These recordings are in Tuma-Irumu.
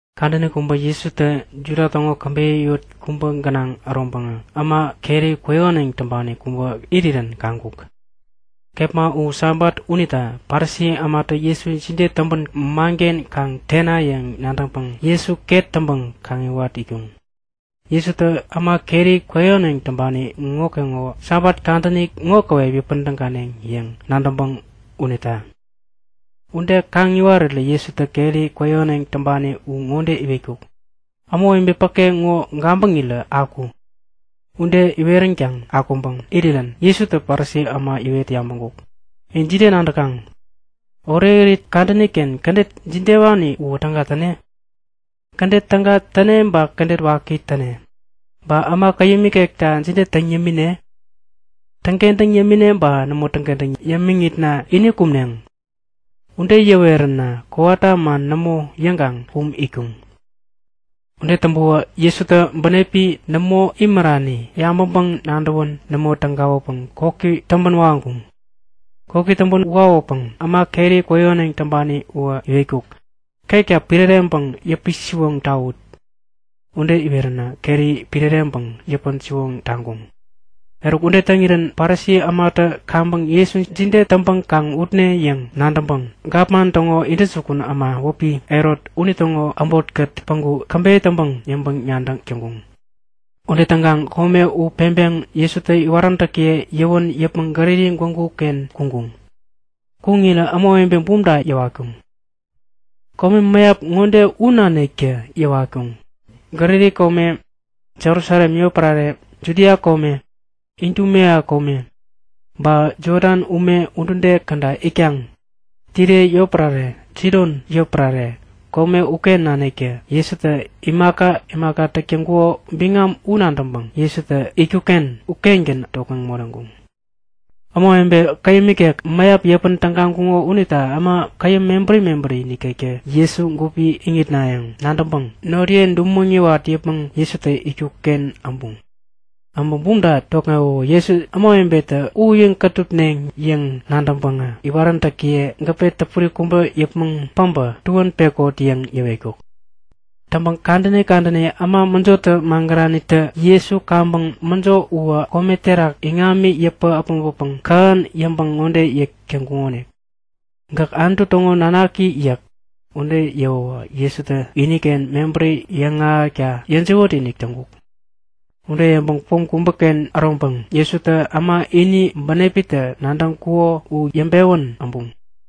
Kadäni kubä Jesutä Juda täŋo käbeyä yot kubä gänaŋ äroŋpäŋä äma keri kwäyähäneŋ täŋpani kubä irirän kaŋkuk. Kepma u Sabat unita Parisi ämatä Jesu jide täŋpäŋ manken kaŋ tene yäŋ nadäŋpäŋ Jesu ket täŋpäŋ kaŋiwat itkuŋ. Jesutä äma keri kwäyähäneŋ täŋpani ŋokeŋowä Sabat kadäni ŋo käwep yäpän täganeŋ yäŋ nadäŋpäŋ unita. Ude kaŋ iwarirä Jesutä keri kwäyähäneŋ täŋpani u ŋode iwetkuk; Ämawebe päke ŋo gabäŋirä aku! Ude iweränkaŋ akuŋpäŋ irirän Jesutä Parisi äma yäwet yabäŋkuk; In jide nadäkaŋ? Orekirit kadäni-ken kädet jidewani uwä täga täne? Kädet täga täne ba kädet waki täne? Ba äma käyäm ikekta jide täŋ yämine? Täŋkentäŋ yämine ba nämo täŋkentäŋ yämiŋitna ini kumneŋ? Ude yäweränä kowata man nämo yäŋkaŋ kum itkuŋ. Ude täŋpäwä Jesutä bänepi nämo imärani yabäŋpäŋ-nadäwän nämo tägawäpäŋ koki täŋpän waŋkuŋ. Koki täŋpän wawäpäŋ äma keri kwäyähäneŋ täŋpani uwä iwetkuk; Ketka piräreŋpäŋ yäpi-siwoŋ tawut! Ude iweränä keri piräreŋpäŋ yäpän-siwoŋ taŋkuŋ. Eruk, ude täŋirän Parisi ämatä kaŋpäŋ Jesu jide täŋpäŋ kaŋ utne yäŋ nadäŋpäŋ gapman täŋo intäjukun äma wäpi Herot unitäŋo äbotkät päŋku käbeyä täŋpäŋ yäŋpäŋ-nadäk täŋkuŋ. Ude täŋkaŋ kome u peŋpeŋ Jesutä iwaräntäkiye yäwän yäpmäŋ Galili gwägu-ken kuŋkuŋ. Kuŋirä ämawebe bumta yäwatkuŋ. Kome mäyap ŋode u naniktä yäwatkuŋ; Galili kome, Jerusalem yotpärare, Judia kome, Idumea kome, kome Jodan ume udude käda itkaŋ, Tire yotpärare, Sidon yotpärare, kome uken naniktä Jesutä imaka imaka täk täŋkuko biŋami u nadäŋpäŋ Jesutä itkuk-ken ukengän tokŋeŋ moreŋkuŋ. Ämawebe käyäm ikek mäyap yäpän tägaŋkuŋo unita äma käyäm mebäri mebäri nikektä Jesu gupi iŋitnayäŋ nadäŋpäŋ noriye dumäŋ yäwat yäpmäŋ Jesutä itkuk-ken äbuŋ. Äbä bumta tokŋewäwä Jesu ämawebetä uyiŋ-kätupneŋ yäŋ nadäŋpäŋä iwaräntäkiye gäpe täpuri kubä yäpmäŋ päbä tuän pekot yäŋ yäwetkuk. Täŋpäŋ kadäni kadäni äma mäjotä magäranitä Jesu kaŋpäŋ mäjo uwä kome terak iŋami yäpä äpmoŋpäpäŋ kähän yäŋpäŋ ŋode yäk täŋkuŋonik; Gäk Anutu täŋo nanaki yäk. Ude yäwäwä Jesutä iniken mebäri yäŋahäkta yäjiwät-inik täŋkuk. Ude yäŋpäŋ pom kubäken äroŋpäŋ Jesutä äma ini bänepitä nadäŋkuko u yäŋpewän äbuŋ.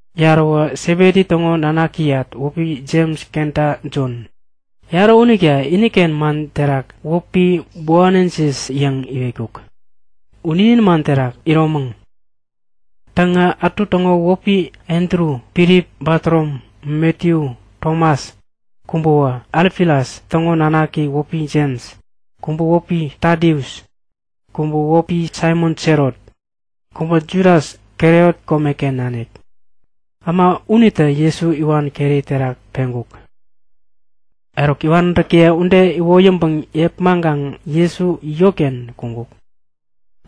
Yaräwä Sebedi täŋo nanakiyat wäpi Jems kenta Jon. Yarä unita iniken man terak wäpi Boaneges yäŋ yäwetkuk. U ninin man terak Iromäŋ. Täŋä ätu täŋo wäpi Andru, Filip, Batorom, Matiyu, Tomas. Kubäwä Alfias täŋo nanaki wäpi Jems. Kubä wäpi Tadius. Kubä wäpi Saimon Selot. Kubä Judas, Kariot komeken nanik. Äma unitä Jesu iwan keri terak peŋkuk. Eruk iwaräntäkiye ude iwoyäŋpäŋ yepmaŋkaŋ Jesu yotken kuŋkuk.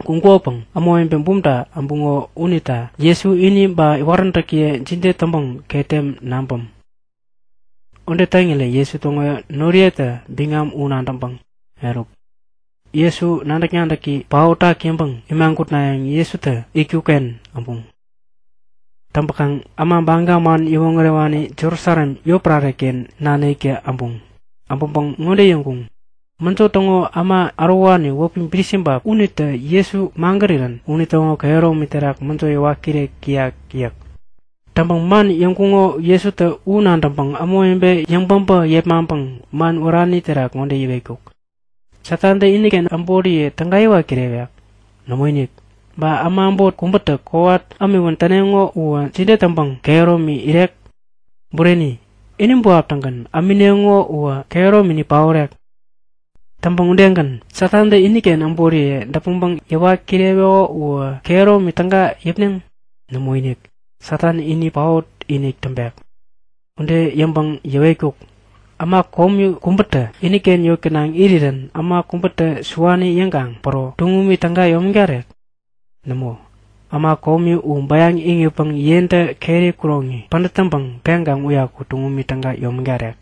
Kuŋkukopäŋ ämawebe bumta äbuŋo unita Jesu ini ba iwaräntäkiye jide täŋpäŋ ketem naŋpäm! Ude täŋirä Jesu täŋo noriyetä biŋam u nadäŋpäŋ, Eruk! Jesu nadäk-nadäki paotak yäŋpäŋ imagutnayäŋ Jesutä itkuk-ken äbuŋ. Täŋpäkaŋ äma Baga man yäwoŋärewani Jerusalem yotpärare-ken naniktä äbuŋ. Äbäŋpäŋ ŋode yäŋkuŋ; Mäjo täŋo äma ärowani wäpi Bilisibap unitä Jesu magärirän unitäŋo kehäromi terak mäjo yäwat kirek täyak! yäk. Täŋpäŋ man yäŋkuŋo Jesutä u nadäŋpäŋ ämawebe yäŋ-päbä yepmaŋpäŋ man wärani terak ŋode yäwetkuk; Satantä iniken äboriye täga yäwat kirewek? Nämoinik! Ba äma äbot kubätä kowat ämiwän täneŋo uwä jide täŋpäŋ kehäromi irek? Bureni, ini buap-tägän ämineŋo uwä kehäromini paorek. Täŋpäŋ udegän Satantä iniken äboriye däpmäŋpäŋ yäwat kireweko uwä kehäromi täga yäpneŋ? Nämoinik! Satan ini paot-inik täŋpek. Ude yäŋpäŋ yäwetkuk; Äma komi kubätä iniken yot gänaŋ irirän äma kubätä siwani yäŋkaŋ päro tuŋumi täga yomägarek? Nämo! Äma komi u bäyaŋ iŋitpäŋ yentä keri kuroŋi pädät täŋpäŋ peŋkaŋ uyaku tuŋumi täga yomägarek.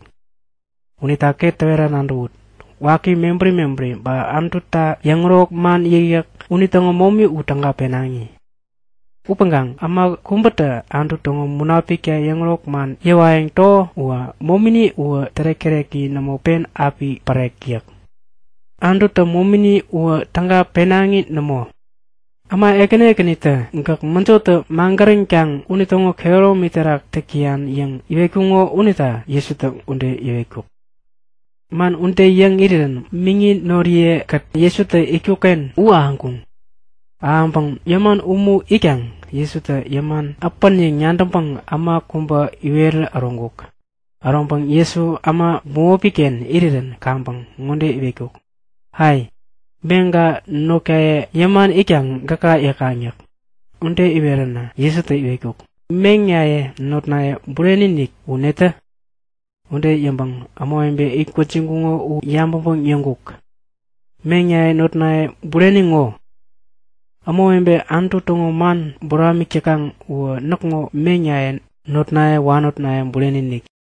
Unita ket täwera nadäwut; Waki mebäri mebäri ba Anututa yäŋärok man yäkyäk unitäŋo momi u täga penaŋi. Upäŋkaŋ äma kubätä Anutu täŋo Munapikta yäŋärok man yäwayäŋ täko uwä momini uwä tärek-täreki nämo pen api pärek yäk. Anututä momini uwä täga penaŋi nämo. Äma ekäni ekänitä Gäk mäjotä magäränkaŋ unitäŋo kehäromi terak täk täyan yäŋ iwetkuŋo unita Jesutä ude yäwetkuk. Man ude yäŋ irirän miŋi noriye-kät Jesutä itkuk-ken u ahäŋkuŋ. Ahäŋpäŋ yäman umu itkaŋ Jesutä yäman äpän yäŋ nadäŋpäŋ äma kubä iwerä äroŋkuk. Äroŋpäŋ Jesu äma bämopi-ken irirän kaŋpäŋ ŋode iwetkuk; Ai! Meŋka notkaye yäman itkaŋ gäka yäkaŋ yäk. Ude iweränä Jesutä iwetkuk; Meŋnaye notnaye bureni-inik u netä? Ude yäŋpäŋ ämawebe it gwäjiŋkuŋo u yabäŋpäŋ yäŋkuk; Meŋnaye, notnaye bureni ŋo! Ämawebe Anutu täŋo man buramik täkaŋ uwä näkŋo meŋnaye, notnaye, wanotnaye bureni-inik.